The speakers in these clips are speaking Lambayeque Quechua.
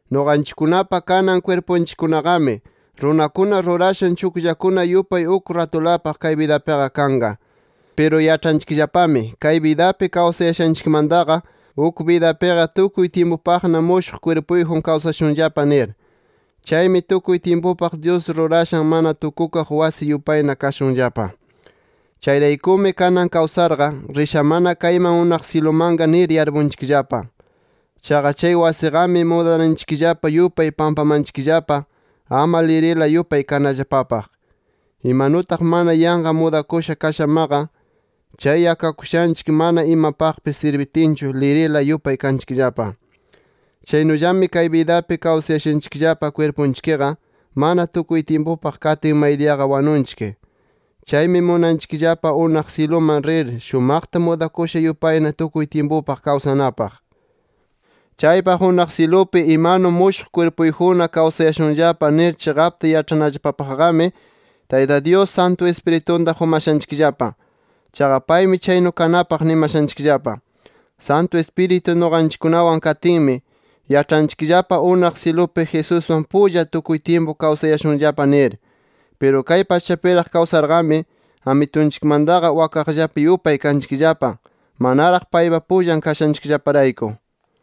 Nuqanchikkunapa kanan kwirpunchikkunaqami, runakuna rurashan chukllakuna yupay uk ratulapaq kay bidapiqa kanqa. Piru yaĉhanchikllapami, kay bidapi kawsayashanchikmantaqa uk bidapiqa tukuy tyimpupaqna mushuq kwirpuyjun kawsashunllapa nir. Chaymi tukuy tyimpupaq, Dyus rurashan mana tukukaq wasi yupayna kashunllapa. Chayraykumi kanan kawsarqa, rishamana kayman unaq syilumanqa nir yarpunchikllapa. Chaqa chay wasiqami, mudananchikllapa yupay pampamanchikllapa, ama lirila yupay kanallapapaq. Imanutaq mana yanqa mudakusha kashamaqa, chay yakakushanchik mana imapaqpis sirbitinchu, lirila yupay kanchikllapa. Chaynullami kay bidapi kawsayashanchikllapa kwirpunchikqa, mana tukuy tyimpupaq katin maydiyaqa wanunchik. Chaymi munanchikllapa unaq syiluman rir, shumaqta mudakusha yupayna tukuy tyimpupaq kawsanapaq. Chaypaq unaq syilupi imanu mushuq kwirpuyjunna kawsayashunllapa nir chiqapta yaĉhanallapapaqqami Tayta Dyus, Santu Ispiritunta qumashanchikllapa. Chaqa paymi chaynu kanapaq nimashanchikllapa. Santu Ispiritu nuqanchikkunawan katinmi, yaĉhanchikllapa unaq syilupi Jesuswan pulla tukuy tyimpu kawsayashunllapa nir. Piru kay pachapiraq kawsarqami, Amitunchikmantaqa wakaqllapi yupay kanchikllapa, manaraq paypa pullan kashanchikllaparayku.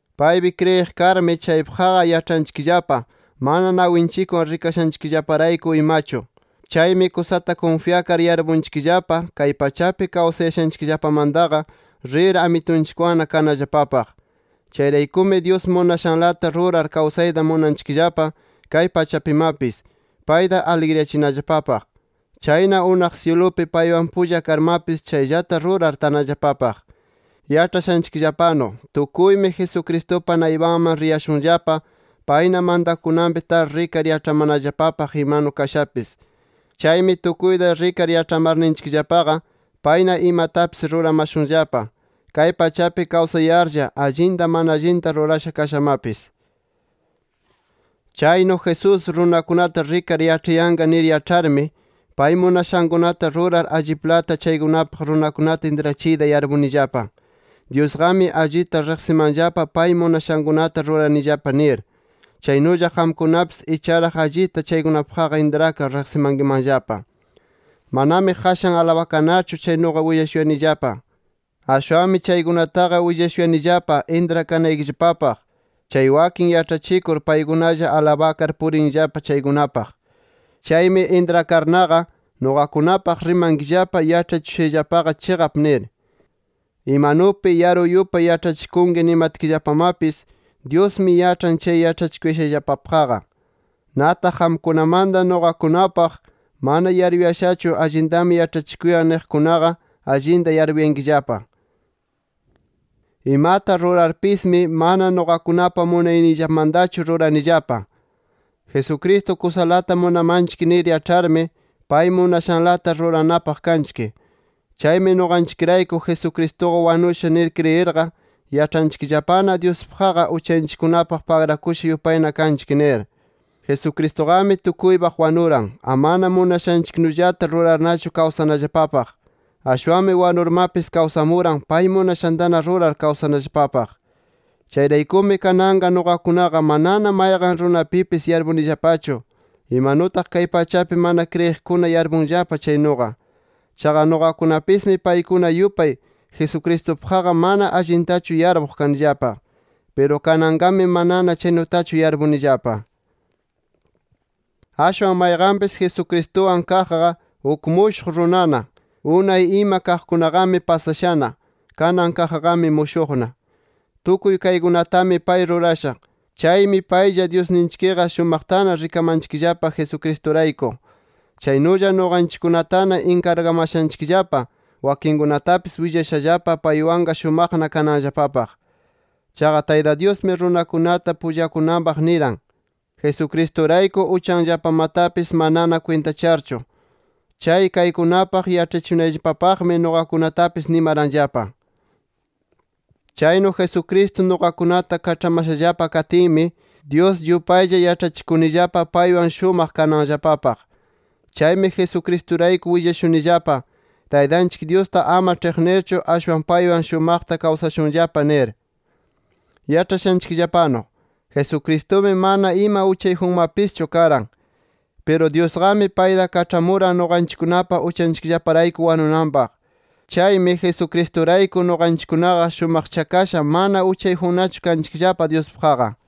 Paypi kriyiq karmi chaypaqqa yaĉhanchikllapa, mana nawinchikwan rikashanchikllaparayku imachu. Chaymi kusata kunfyakar yarpunchikllapa kay pachapi kawsayashanchikllapamantaqa rir, Amitunchikwanna kanallapapaq. Chayraykumi Dyus munashanlata rurar kawsayta munanchikllapa kay pachapimapis, payta aligriyachinallapapaq. Chayna unaq syilupi paywan pulla karmapis chayllata rurar tanallapapaq. Yaĉhashanchikllapanu tukuymi, Jesucristupa naypanman riyashunllapa, payna mantakunanpi tar rikar yaĉhamanallapapaq imanu kashapis. Chaymi tukuyta rikar yaĉhamarninchikllapaqa, payna imatapis ruramashunllapa, kay pachapi kawsayarlla, allinta mana allinta rurasha kashamapis. Chaynu Jesús runakunata rikar yaĉhayanqa nir yaĉharmi, pay munashankunata rurar alliplata chaykunapaq runakunata intrachiyta yarpunillapa. Dyusqami allita riqsimanllapa pay munashankunata ruranillapa nir, chaynulla qamkunapis icharaq allita chaykunapaqqa intrakar riqsimankimanllapa. Manami qashan alabakanarchu chaynuqa willashuyanillapa. Ashwanmi chaykunataqa willashuyanillapa intrakanaykillapapaq, chay wakin yaĉhachikur paykunalla alabakar purinllapa chaykunapaq. Chaymi intrakarnaqa, nuqakunapaq rimankillapa, yaĉhachishushayllapaqa chiqap nir. Imanupi yaru yupay yaĉhachikunki nimatkillapamapis, Dyusmi yaĉhan chay yaĉhachishuyashayllapapaqqa. Nataq qamkunamanta nuqakunapaq, mana yaruyashachu allintami yaĉhachikuyan niqkunaqa, allinta yarpuyankillapa. Imata rurarpismi mana nuqakunapa munayniyllamantachu ruranillapa. Jesucristo kusalata munamanchik nir yaĉharmi, pay munashanlata ruranapaq kanchik. Chaymi nuqanchikrayku, Jesucristuqa wanusha nir kriyirqa, yaĉhanchikllapana Dyuspaqqa uchanchikkunapaq pagrakusha yupayna kanchik nir. Jesucristuqami tukuypaq wanuran, amana munashanchiknullata rurarnachu kawsanallapapaq. Ashwanmi wanurmapis kawsamuran, pay munashantana rurar kawsanallapapaq. Chayraykumi kananqa nuqakunaqa manana mayqan runapipis yarpunillapachu, imanutaq kay pachapi mana kriyiqkuna yarpunllapa chaynuqa. Chaqa nuqakunapismi paykuna yupay, Jesucristupaqqa mana allintachu yarpuq kanillapa. Piru kananqami manana chaynutachu yarpunillapa. Ashwan mayqanpis Jesucristuwan kaqqa, uk mushuq runana. Unay ima kaqkunaqami pasashana; kanan kaqqami mushuqna. Tukuy kaykunatami pay rurasha. Chaymi paylla Dyusninchikqa shumaqtana rikamanchikllapa, Jesucristurayku. Chaynulla nuqanchikkunatana inkargamashanchikllapa wakinkunatapis willashallapa, paywanqa shumaqna kananllapapaq. Chaqa, Tayta Dyusmi runakunata pullakunanpaq niran, Jesucristurayku uchanllapamatapis manana kwintacharchu. Chay kaykunapaq yaĉhachikunayllapapaqmi nuqakunatapis nimaranllapa. Chaynu Jesucristo nuqakunata kaĉhamashallapa katinmi, Dyus yupaylla yaĉhachikunillapa paywan shumaq kananllapapaq. Chaymi Jesucristurayku willashunillapa: Taytanchik Dyusta ama ĉhiqnirchu, ashwan paywan shumaqta kawsashunllapa nir. Yaĉhashanchikllapanu, Jesucristumi mana ima uchayjunmapischu karan. Piru Dyusqami, payta kaĉhamuran nuqanchikkunapa uchanchikllaparayku wanunanpaq. Chaymi, Jesucristurayku nuqanchikkunaqa shumaqchakasha mana uchayjunnachu kanchikllapa Dyuspaqqa.